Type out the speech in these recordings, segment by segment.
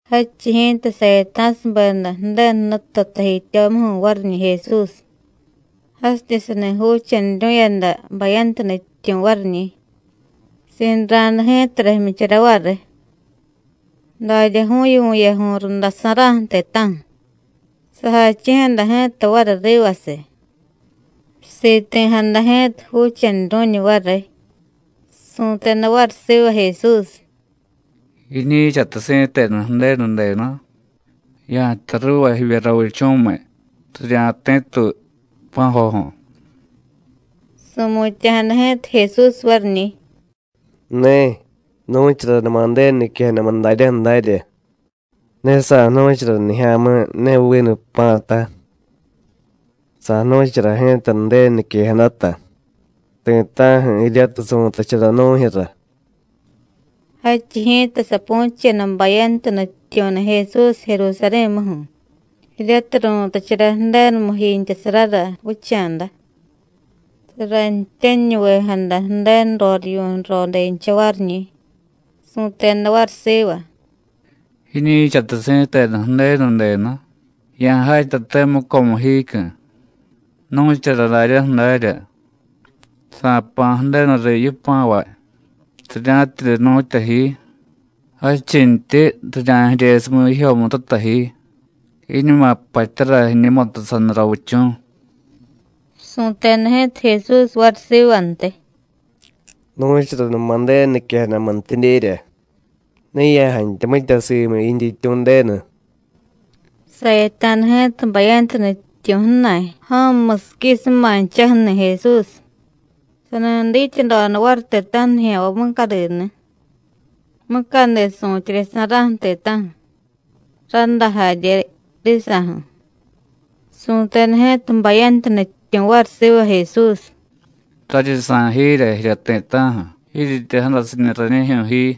Jadchiy ji̱ta sayata̱subeda Ju̱denu Jnutu tajityomuju̱ variñi̱ Jesús, jasityidye sani juuchanuru̱yada bayantu nutyityu̱ variñi̱. Sinra̱da ji̱tara jmyichara variy, daryaju̱yu vu̱yaju̱y rundasa̱ra̱ju̱ ti̱ta̱ju̱, sajachi̱jada ji̱ta variy rivasiy. Siti̱jada ji̱ta Juuchanuru̱ñu variy, su̱teda variy siva Jesús: “Jiñi̱chatiy si̱tenu Ju̱denu denu, ya̱jtay ruuva jivye ravichu̱miy, rirya̱ti̱tuy pa̱joju̱.” Su̱mutya̱jada ji̱ta Jesús variñi̱: “Ne, nu̱charanuma Ju̱denu niquejadamu daryaju̱ darya: Ne sa̱jnu̱chara nijya̱mi̱ ne vinu pa̱ta, sa̱jnu̱chara ji̱ta Ju̱denu niquejadata, ti̱ta̱ju̱ jiryatiy su̱tachara nu̱jyu̱ra.” Jadchiy ji̱ta sapu̱cheda bayantu nutyityu̱ni̱ Jesús Jerusarí̱muju̱, jiryatiy ru̱tachara Ju̱denumu jiintyasarara vicha̱da. Saranityaniñuvejada Ju̱denu rorivyu̱ nrodencha variñi̱. Su̱teda variy siva: “Jiñi̱chatiy si̱tenu Ju̱denu denu, ya̱jatyate mucomu jiicyu̱, nu̱chara daryaju̱ darya: Sa̱jpa̱ Ju̱denuriy yipa̱vay rirya̱tidye jnu̱tya ji, jadchintyi: Rirya̱jiryesumiy jijyomututa ji, jiiñuma jpatyara jiñumutu saniy ravichu̱.” Su̱teda ji̱ta Jesús variy sivantiy: “Nu̱charanuma Ju̱denu niquejadamuntidyerya: Ne ya̱jantya mitya simu yintyityu̱ Ju̱denu.” Sayata̱da ji̱ta bayantu nutyityu̱ ju̱na̱y ja̱mu musiquisumanchaju̱ni̱ Jesús, sani dityadoda variy ti̱ta̱ju̱ nijya̱nvay mucadini̱, mucadi su̱tyeryasa̱ra̱ju̱ ti̱ta̱ju̱, rádá jarye risa̱ju̱. Su̱teda ji̱ta bayantu nutyityu̱ variy siva Jesús: “Raryi sa̱y jiirya jirya ti̱ta̱ju̱, jiiryityi jadasiñu rañijyu̱ ji.”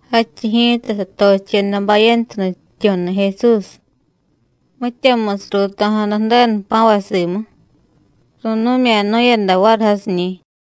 Jadchiy ji̱ta, satocheda bayantu nutyityu̱ni̱ Jesús. Mityamusiy ruuto̱jada Ju̱denu jpa̱vay simu, ru̱nu̱mya̱nu̱yada variy jasiñi̱.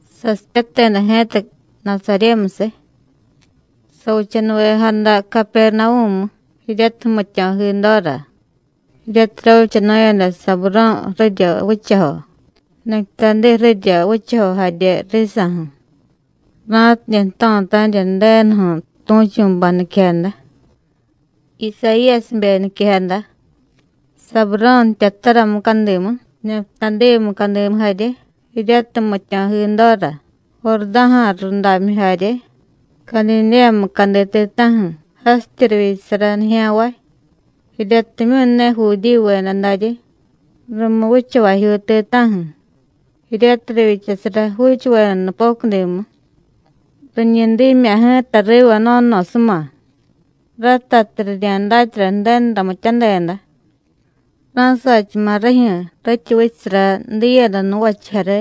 Sasipyateda ji̱ta Nasaryémusiy, savichanuvejada Capernavú̱mu, jiryatiy jmityo̱ jidora, jiryatiy ravichanu̱yada Saburó̱ ju̱rirya vichajo, Nejtadí ju̱rirya vichajo jarye risa̱ju̱, ra̱tidye jto̱tanirya Ju̱denuju̱ tu̱chu̱bay niquejada, Isayíyasibe niquejada: “Saburó̱ jtyatara mucadimu, Nejtadí mucadimu jarye, jiryatiy jmityo̱jidora, Jurdá̱ja̱ rudamyu jarye, Cadidéya mucadi ti̱ta̱ju̱ jasityi rivyichasara nijya̱nvay jiryatimyu̱ ne Judíyuveda daryi, rumu vichavajyuu ti̱ta̱ju̱ jiryatiy rivyichasara juuchuveda nupocudimu, riñi dimya̱ ji̱ta riva no̱no̱suma, ratatiy rirya̱datyara Ju̱denu ramityadeda; ra̱sachama̱ rijyu̱ rityi vichasara diiyada nuvachiy jare,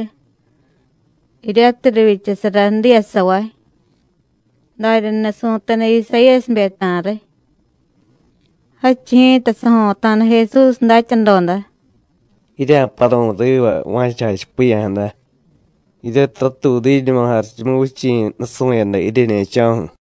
jiryatiy rivyichasara diiyasavay.” Daryani̱ su̱teda Isayíyasibe ta̱riy. Jadchiy ji̱ta sajo̱ta̱da Jesús datyadoda: “Jirya̱paru̱y riva va̱cha jachipiya̱jada, jiryatiy ratuudiñuma Jarichumuvichi̱ nusu̱yada jiryeñe̱cho̱ju̱.”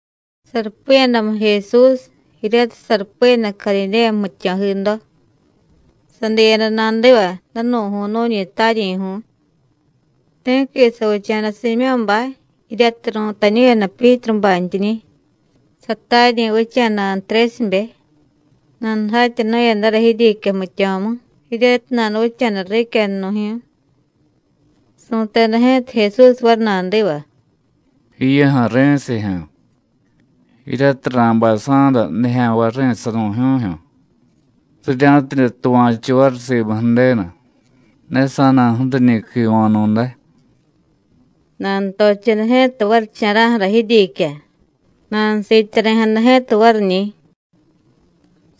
Sarupiyadamu Jesús, jiryatiy sarupiyada Cadidéya jmityo̱ jido, sadiyada nadiva danu̱ju̱y nu̱ñi taryi̱ju̱y. Ti̱qui savicha̱da Siimyó̱bay jiryatiy ru̱tañu̱yada Pyítrubantyiñi̱, sataryi̱ vicha̱da Antrésibe. Nanujatyanu̱yadara jiryiicya jmityo̱mu jiryatiy nanuvicha̱da riicyanu̱jyu̱y. Su̱teda ji̱ta Jesús variy nadiva: “Jiyuju̱, ri̱sijyu̱, jiryatiy ra̱bay sa̱da nijya̱nvay ju̱ri̱sanu̱jú̱jyu̱, rirya̱tidye tuva̱chu variy simu Ju̱denu. Ne sa̱na̱ju̱riñi̱ quiva̱nu̱day.” Nanutocheda ji̱ta varicha̱ra̱ju̱ra jiryiicya, nanusiityari̱jada ji̱ta variñi̱.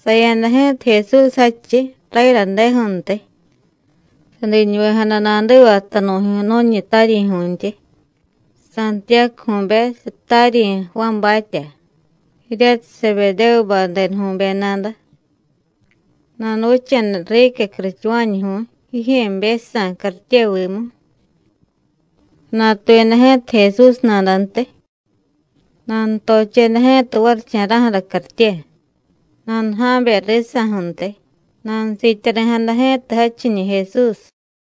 Saya̱da ji̱ta Jesús jadchiy rayadadeju̱ntiy, sadiñuvejada nadiva tanu̱ju̱y nu̱ñi taryi̱ju̱ntyi, Santiyácuju̱be, sataryi̱ Juánbatya, jiryatiy Sebedévubay denuju̱be nada. Nanuvicha̱da riicya curuchuva̱ñuju̱y jijye̱bejsa̱ cartyevimu. Sanatuyada ji̱ta Jesús nadantiy. Nanutocheda ji̱ta varicha̱ra̱ju̱ra cartye, nanuja̱be risa̱ju̱ntiy, nanusiityari̱jada ji̱ta jadchiñi̱ Jesús.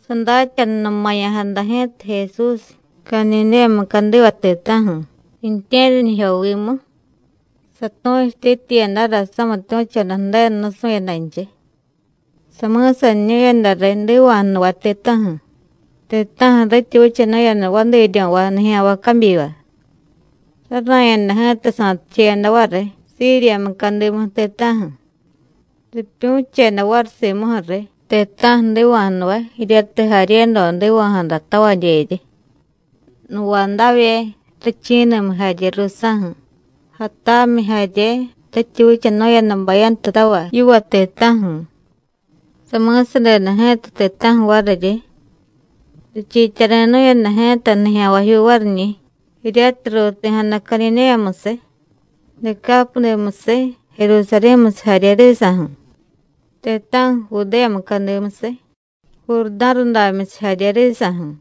Sadatyanunumaya̱jada ji̱ta Jesús Cadidéya mucadiva ti̱ta̱ju̱, riintye̱ryanijyovimu, satu̱chutityiyadara samitu̱choda Ju̱denu nusu̱yadanchiy. Sami̱saniñu̱yada riy jdiva̱jnuvay ti̱ta̱ju̱, ti̱ta̱ju̱ rityi vichanu̱yada vadiiryo̱vay nijya̱nvay cabyiva. Rara̱yada ji̱ta sa̱ticheyada variy Síriya mucadimu ti̱ta̱ju̱. Ripyu̱cheda variy simuju̱ riy ti̱ta̱ju̱ jdiva̱jnuvay jiryatiy jaryedo jdiva̱jadatavadyeryi, nuvadavye, ju̱richi̱ni̱miy jarye ruusa̱ju̱, jatamyi jarye, rityi vichanu̱yada bayantutavay yiva ti̱ta̱ju̱. Sami̱sadeda ji̱ta ti̱ta̱ju̱ variryi. Richiityari̱nu̱yada ji̱ta nijya̱nvajyuu variñi̱, jiryatiy ruuti̱jada Cadidéyamusiy, Decápudimusiy, Jerusarí̱musiy jarye risa̱ju̱, ti̱ta̱ju̱ Judéya mucadimusiy, Jurdá̱rudamyusiy jarye risa̱ju̱.